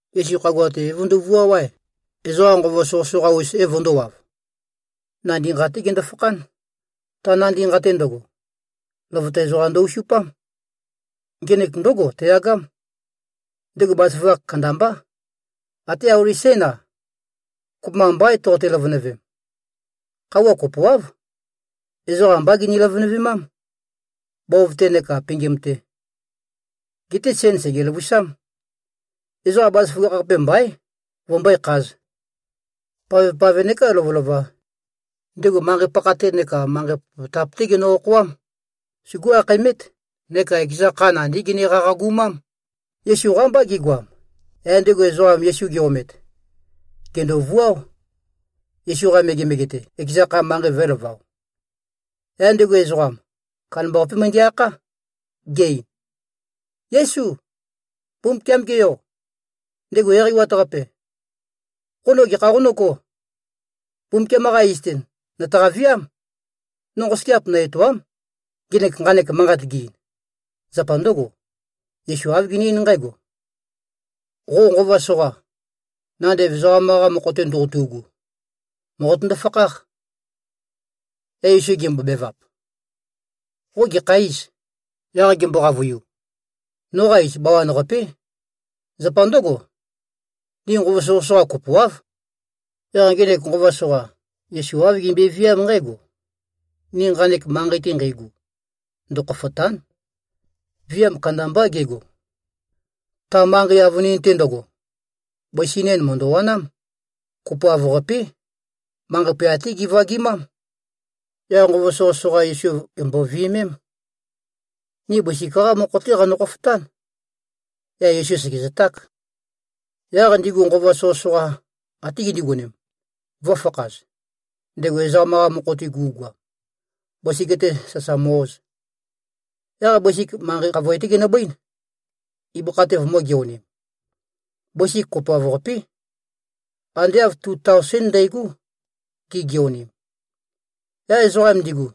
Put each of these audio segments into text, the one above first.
Yesu khagua-te é-vøndovuáo-ae, ezoqa nqova soqøsoqa-us é-vøndōwav. Nandi nqa-té gendo-fakhán. Ta nandi nqa-te ndøgo, løvøte ezoqam ndø-osupám. Ngenek ndǿgo teyagám. Ndego bazaføgakh kandambá. Até auli sén-a, kopømba mbaín, toqote-løvønøvem. Khøuwa kopoáv, ezoqa ambá gini-løvønøvemám, bov-té neka pingim-te. Geté sen sègezø-løvusám. Ezoqa bazaføgakh-qape mbaín, vømbøé-khāz. Pavpave neká lovølova, ndego manqei-pakha-te neka manqei popotap-té genø-okhoám. Sugú-akhaemét neka ekeza kha nandí gene-qaqagumám. Yesu qámbá gegoam. Yaq ndego ezoqam Yesu ge-omet, gèndovuáo, Yesu-qa megemege-te, ekeza kha, manqei vø̄elavao. Yaq ndego ezoqam, kandambaqapé møndæ-akhá, ge-ein, “Yésu, Mbumbukiam-ge Yo, ndego Eqeiwat-Qape, qo no gekha qonǿgō? Mbumbukiam-qa iz-te, nø̀taqa-viám, no nqosøgeap nø-etòa᷄m!” Ndego nqanek manqat ge-ein, zapa ndǿgo: Yesu āv gene-eín nqǽgo, “Qo nqova soqa, nandev ezoqam-qa mokho-te ndoqotu꞉gu, mòqotøndo-fakháq.” Yaq Yesu gembobevap, “Qo gekha îz?” Yaq gembo-qavøiu, “Noqa iz Bawan-qapé. Zapa ndǿgo, ni nqova soqøsoqa kopoáv.” Yaq ngenek nqova soqa, Yesu āv gembøeviám nqǽgo, “Ni nqanek manqei-te nqeigu, ndøkhofòta᷄n.” Viam kandambá gego. Ta manqei avønin-te ndøgo, bøsi nen mø̀ndøwanám. Kopoav-qapé. Manqei poyat-té givagimám. Yaq nqova soqøsoqa Yesu gimbo-viømem, “Ni bøsik-qá mokho-té qanø-khofotán.” Yaq Yesu sègezøták. Yaq ndigu nqova soqøsoqa até gindigonem, vø̄fakhaz, ndego ezoqam-qa mokho-te gu꞉goam, bøsik-te sasa mø-oz. Yaq bøsik manqei khavoe-té ginøbøín, ibøkha-te vømø̄-geonim. Bøsik kopoav-qapé, ande āv tu taosén ndægó, gigeonim. Yaq ezoqam ndigu,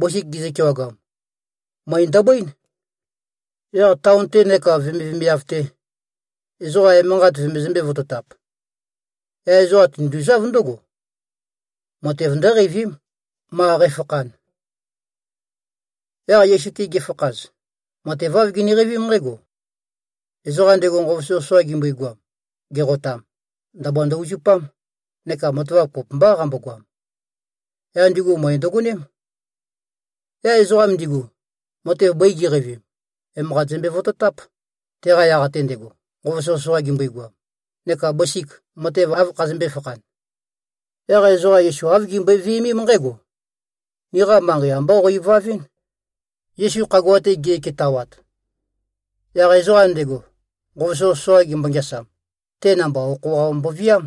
bøsik gizø-kewagam, møe ndøbøín, yaq taon-te neka vemivemiav-te, ezoqa emanqat vømøzømbē-vototap. Yaq ezoqa tinduzáv ndǿgo, matev ndǿqeivím, ma qæfakhan. Yaq Yesu-te gifakhaz, matev āv giniqeivím nqǽgo: Ezoqam ndego nqova soqøsoqa gimbøigoam, geqotam, ndabua ndø-uzupám neka matavap kopømbá qambogoam. Yaq ndigu møe ndøgoném. Yaq ezoqam ndigu, matev bøi gi꞉qeivim, emanqat zømbe-vototáp, teqa yaq-te ndego, nqova soqøsoqa gimbøigoam, neka bøsik, matev ande āv khazømbē-fakhan. Yaq ezoqa Yesu āv gimbøe-viømém nqǽgo, “Niqa manqei ambá qo-ivavɨ́n.” Yesu khagua-te ge꞉ketawat, yaq ezoqam ndego, nqova soqøsoqa gembo-ngeasam, te namba okho-qa mboviám.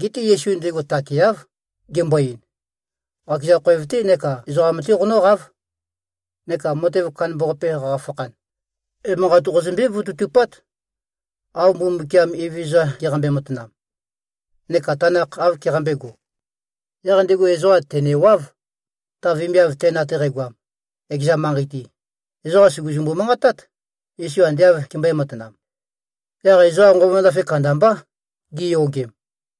Geté Yesu ndego takeáv, gembo-ein, “Qakeza khoev-té neka ezoqam-té qonǿqáv. Neka matev kandambaqape qaqafakhan, emanqat qozømbé-vototupát, av Mbumbukiam Evezøza geqambe-matanam neka tanakh āv keqambēgo.” Yaq ndego ezoqam tènewáv. Ta vemiav ten ate qægoam, ekeza manqei-te, ezoqa sùguzumbu-manqatát, Yesu ande āv kembøē-matanam. Yaq ezoqa nqova ndafe kandambá, giyogem.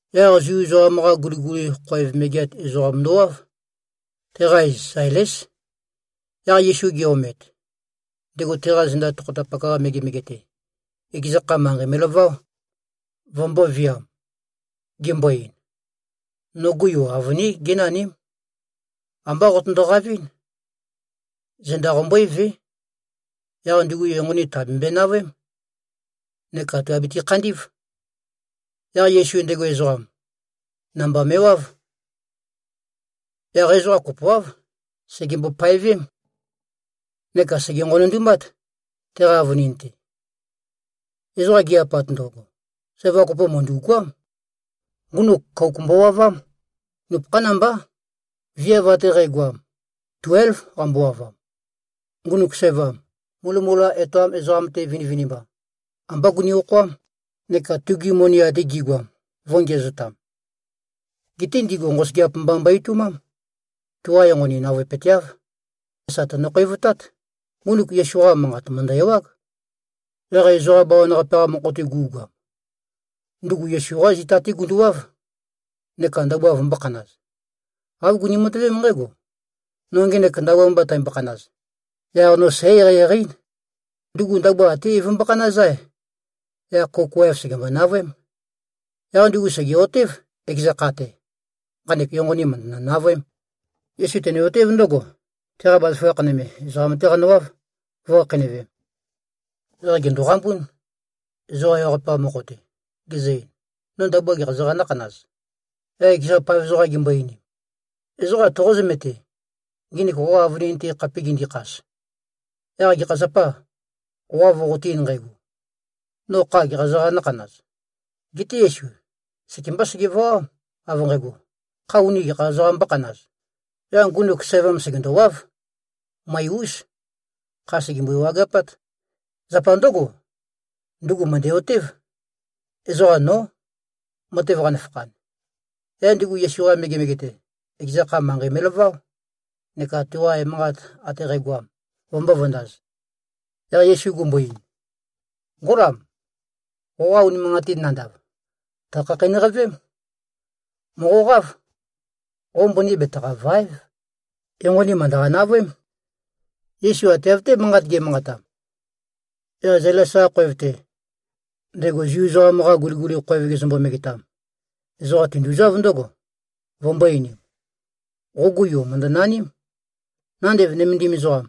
yaq Zu ezoqam-qa guliguli khoev megeat ezoqam ndowáv. Teqa iz Zailés. Yaq Yesu ge-omet, ndego teqa zenda tokhotapak-qa megemege-te, ekeza kha, manqei me꞉laváo, vømbōviam, gembo-ein, “Nogu yu avønín génaním. Ambá qotondo-qavɨ́n. Zenda qombøévé. Yaq ndugu enqoni tàbembøe-navøém neka tùabete-khandí꞉v.” Yaq Yesu ndego ezoqam, namba me꞉wáv. Yaq ezoqa kopoáv, segembo-paevém, neka sège-nqonondumát, teqa avønin-te. Ezoqam gi-apat ndøgo, sævam kopo mø̀ndu꞉goám. Ngunuk kouk mbowavám. Nupøkhán mbá. Viav ate qægoam, tuélv qambowavam. Ngunuk sævam, mulømula etoam ezoqam-te vinivinimba, ambá guni-okhoám, neka tugi moni ate gi꞉goam vō꞉ngiæzotam. Geté ndigu nqosøgeap mba mbo-etoumám. Tuqa enqoni navøepøteáv. Sà tønø-khouwevtát. Ngunuk Yesu-qa manqat mø̀ndø-ewág. Yaq ezoqa bawan-qape-qa mokho-te gu꞉goam, ndugu Yesu-qá zita-té gunduwáv, neka ndabua vømbō-khanaz. Āv guni-matøvém nqǽgo, “No ngenek ndabua mba tæmbokhanaz, yaq no sǽ-eqeieqei-én.” Ndugu ndabua até é-vømbokhanáz-ae, yaq kouk waev sègembo-navøém. Yaq ndugu sège꞉-otév, ekeza kha-te, “Nqanek enqoni mø̀ndønø-navøém.” Yesu tene-otév ndǿgo, teqa bazaføgakh nøme, ezoqam-té qanøwáv, vø̄khakheinøvem. Yaq gèndoqambún, ezoqa ewaqape-qa mokho-te, gezø-ein, “No ndabua gekha ezoqām nǿkhanaz?” Yaq ekeza paev ezoqam gimbo-einim, “Ezoqam toqó-zømete, nginik qoqa avønin-te khape gindikhas? Yaq gekha zapâ, qo av qoqote-ein nqægo, ‘No kha gekha ezoqām nǿkhanaz?’” Geté Yesu sekembá segevawám, av nqægo, kha uni gekha ezoqām mbókhanaz? Yaq ngunuk sævam sègendowáv. Møe-ús. Kha sègembøi-wageapát. Zapa ndǿgo, ndugu mø̀ndæ-otév, ezoqa nó, matev qanøfakhan. Yaq ndugu Yesu-qa megemege-te, ekeza kha, manqei me꞉laváo, neka tuqa emanqat ate qægoam, vømbō-vøndaz. Yaq Yesu gumbo-ein, “Ngólam. Qoqa unimanqatin nandav, tø̀khakheinøqavém. Mòqoqáv. Qo mbøni betaqàva᷄ev. Enqoni mø̀ndøqa-navøém.” Yesu ate av-té manqat ge꞉manqatam, yaq Zailes-qa khoev-te, ndego Zu ezoqam-qa guliguli khoev gezømbo-megetam, ezoqam tinduzáv ndǿgo, vømbō-einim, “Qogu yu mø̀ndønaním. Nandev nømendim ezoqam,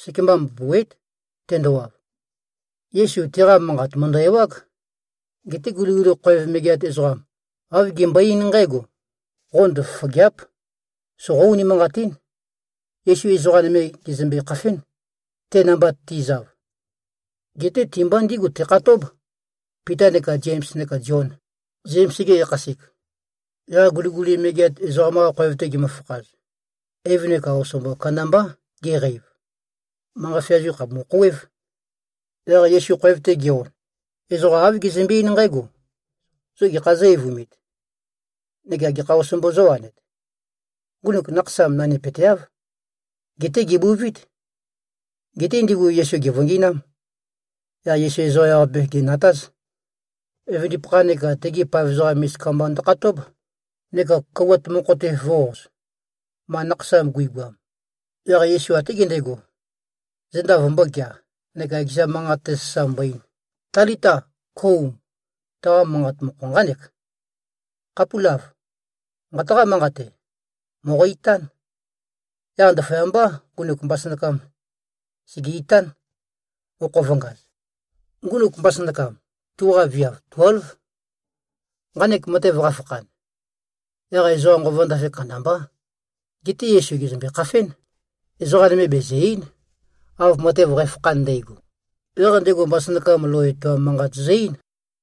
sekemba mbopòuwe᷄꞉t, tendowav.” Yesu tiqa manqat mø̀ndø-ewág. Geté guliguli khoev megeat ezoqam, āv gembøe-eín nqǽgo, “Qo ndøfofògea᷄p! Soqó-unimanqatín.” Yesu ezoqa nøme gèzømbe-khafén, te namba ti꞉zav. Geté ti-mba ndígu tekhatób, Pita neka Zems neka Zion, Zems-ge yakhasek. Yaq guliguli megeat ezoqam-qa khoev-te gimøfakhaz, eiv neka osombo kandambá geqeiv. Manqa feazu khàpumu-khouwév. Yaq Yesu khoev-te ge-on, ezoqa āv gezømbe-eín nqǽgo, “Zo gekhā zǿ-eivumit? Neka gekha osombo zówanet? Ngunuk nakhasam nanimateáv. Geté gèbuvít.” Geté ndigu Yesu gèvøngi꞉nám. Yaq Yesu ezoqa ewaqape gènatáz. Evøndipakha neka tegi paev ezoqam misika mba ndøkhatób, neka kouwat mokho-te vø̄-oz, ma nakhasam guigoam. Yaq Yesu até gendego, zenda vømbōgea neka ekeza manqat-te sasa mbo-ein, “Talita, kóum!” Taqa manqa mokho nqánek, “Khapúlav. Nqataqá-manqate. Mòqo-itán!” Yaq ndaføyambá, ngunuk mbasønakam sège-itán, okho vø̄ngaz. (Ngunuk mbasønakam, tuqa viav tuélv.) Nqanek matev qafakhan, yaq ezoqa nqova ndafe kandambá. Geté Yesu gèzømbe-khafén. Ezoqa nøme bezø̀-ei᷄n, av matev qæfakhan ndægo. Yaq ndego mbasønakam lou etoam manqat zø-eín.